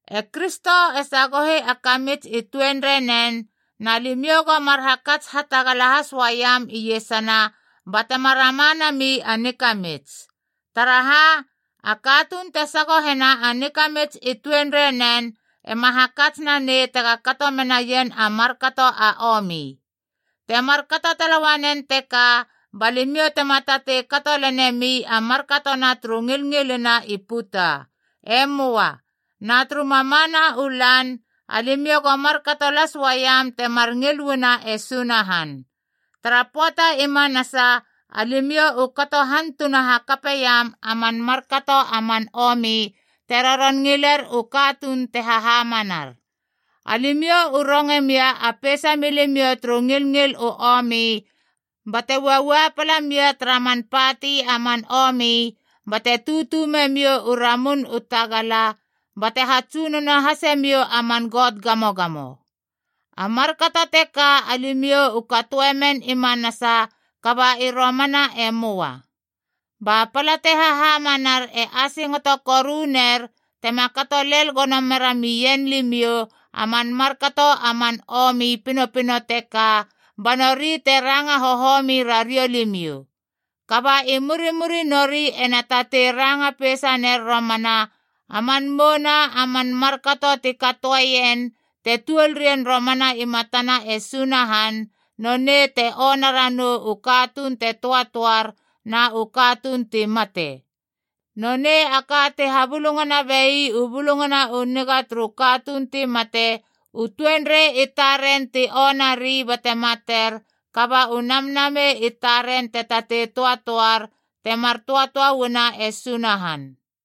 E Kristo e sagohi a kamits i tuenreinen, na limiou go mar hakats hatagala has uaiam iesana batema rama nami a nikamits. Taraha, a katuun te sagohena a nikamits i tuenreinen ema hakats nanei tega kato menaien a markato a omi. Te markato tala uanen teka ba limiou tema tatei kato lenemi a markatona turu ngilngilina i puta. E möa. Na turu mamana u lan alimiou go markato las uaiam temar ngil uana e Sunahan. Tara pöata i manasa alimiou u kato hantuna hakapeiam man markato a man omi te roron ngiler u katuun te hahamanar. Alimiou u ronge mia a peisa milimiou turu ngilngil u omi bate uaua pala mia tara man pati a man omi, bate tutu memiou u ramun u tagala, bate hatsunono hase miou a man got gamogamo. A markato teka alimiou u katoe men i manasa kaba i romana e möa. Ba pala te hahamanar e asingoto koru ner tema kato lel gono mera mien limiou a man markato a man omi pinopino teka, ba nori te ranga hohomi rariou limiou. Kaba i murimuri nori ena tatei ranga peisa ner romana a man mouna a man markato ti katoeien te tuol rien romana i matana e Sunahan, nonei te ona ranou u katuun te töatöar na u katuun ti mate. Nonei a ka ti habulungana bei u Bulungana u Niga turu katuun ti mate, u tuanrei i taren ti onari bate mater, kaba u namnamei i taren te tatei töatöar temar töatöa uana e Sunahan.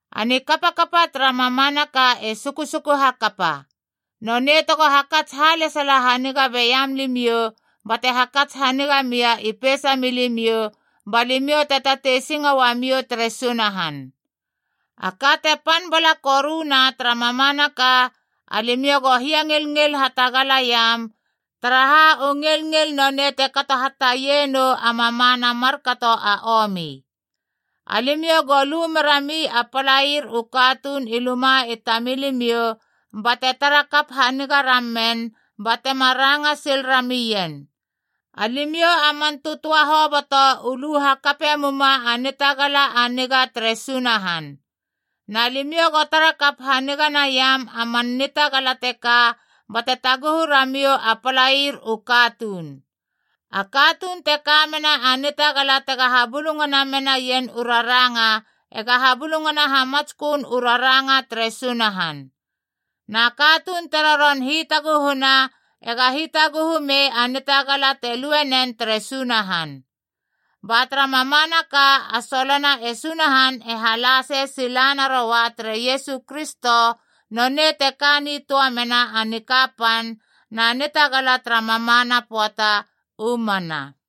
A nikapakapa tara mamanaka e susuku hakapa. Nonei tego hakats halesala haniga beiam limiou bate hakats haniga mia i peisamiou ba limiou te tatei singo uamiou tere Sunahan. A ka te pan bala koruna tara mamanaka, alimiou go hiangilngil hatagalaiam, taraha u ngilngil nonei te kato hataie nou a mamana a markato a omi. Alimiou go lu merami a palair u katuun i luma i tamilimiou, bate tarakap haniga ramen batema ranga sil ramien. Alimiou a man tötöa hoboto u lu hakape muma a nitagala a niga tere Sunahan. Na limiou go tarakap haniga naiam a man nitagala teka bate taguhu ramiou a palair u katuun. A katuun te ka mena a nitagala tega habulungana menaien u raranga, ega habulungana hamatskön u raranga tere Sunahan. Na katuun te roron hitaguhuna ega hitaguhu mei a nitagala te lue nen tere Sunahan. Ba tara mamanaka a solona e Sunahan e hala sei sila naroa tere Iesu Kristo, nonei te ka nitöa mena a nikapan na nitagala tara mamana pöata. U mana.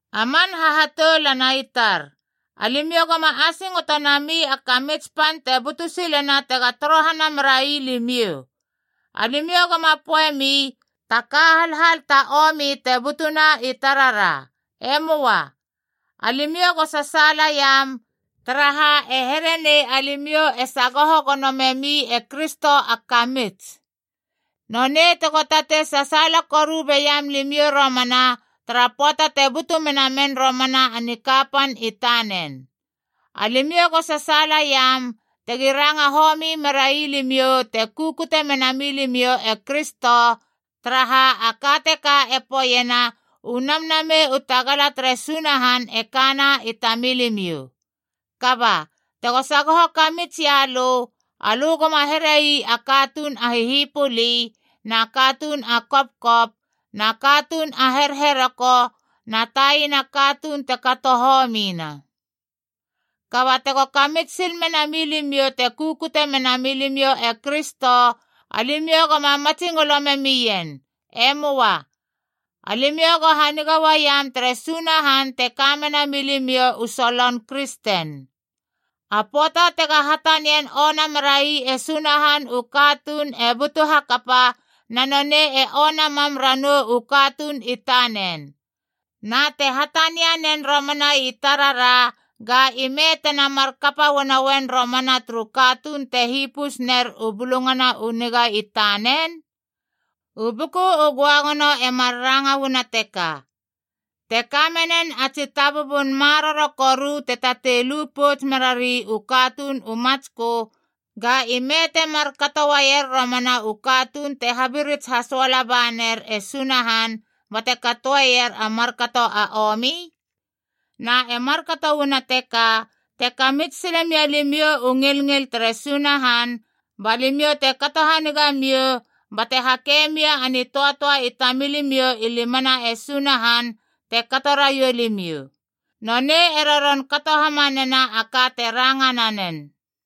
A man hahatoulana i tar, alimiou goma asingoto nami a kamits pan te butu silena tega torohana merai limiou. Alimiou goma poeiemi, “Ta ka halhal ta omi te butuna i tarara.” E möa. Alimiou go sasaalaiam, taraha e here nei alimiou e sagoho gono memi e Kristo a kamits. Nonei tego tatei sasaala koru beiam limiou romana tara pöata te butu mena men romana a nikapan i tanen. Alimiou go sasaalaiam tegi ranga homi merai limiou te kukute mena milimiou e Kristo, taraha a ka teka e poeiena u Namnamei u tagala tere Sunahan e kana i tamilimiou. Kaba, tego sagoho kamits ia lö, alö goma here ii a katuun a hihipuli, na katuun a kopkop, na katuun a herheroko, na taina katuun te kato homina. Kaba tego kamits sil mena milimiou te kukute mena milimiou e Kristo, alimiou goma matsingolo memien. E möa. Alimiou go haniga uaiam tere Sunahan te ka mena milimiou u solon “kristen.” A pöata tega hatanian ona merai e Sunahan u katuun e butu hakapa, na nonei e ona mam ranou u katuun i tanen. Na te hatania nen romana i tarara, ga ime tena mar kapa uanoen romana turu katuun te hipus ner u Bulungana u Niga i tanen? U Buku u Göagono e mar ranga uana teka: “Te kamenen a tsi tabubun maroro koru te tatei lu pouts merari u katuun u matskö, Ga ime te markato ueier romana u katuun te habirits hasoala baner e Sunahan bate katoeier a markato a omi?” Na e markato uana teka, te kamits sile mia limiou u ngilngil tere Sunahan, ba limiou te kato haniga miou, bate hake mia a nitöatöa i tamilimiou i limana e Sunahan te kato raiou limiou. Nonei e roron kato hamanena a ka te ranga nanen.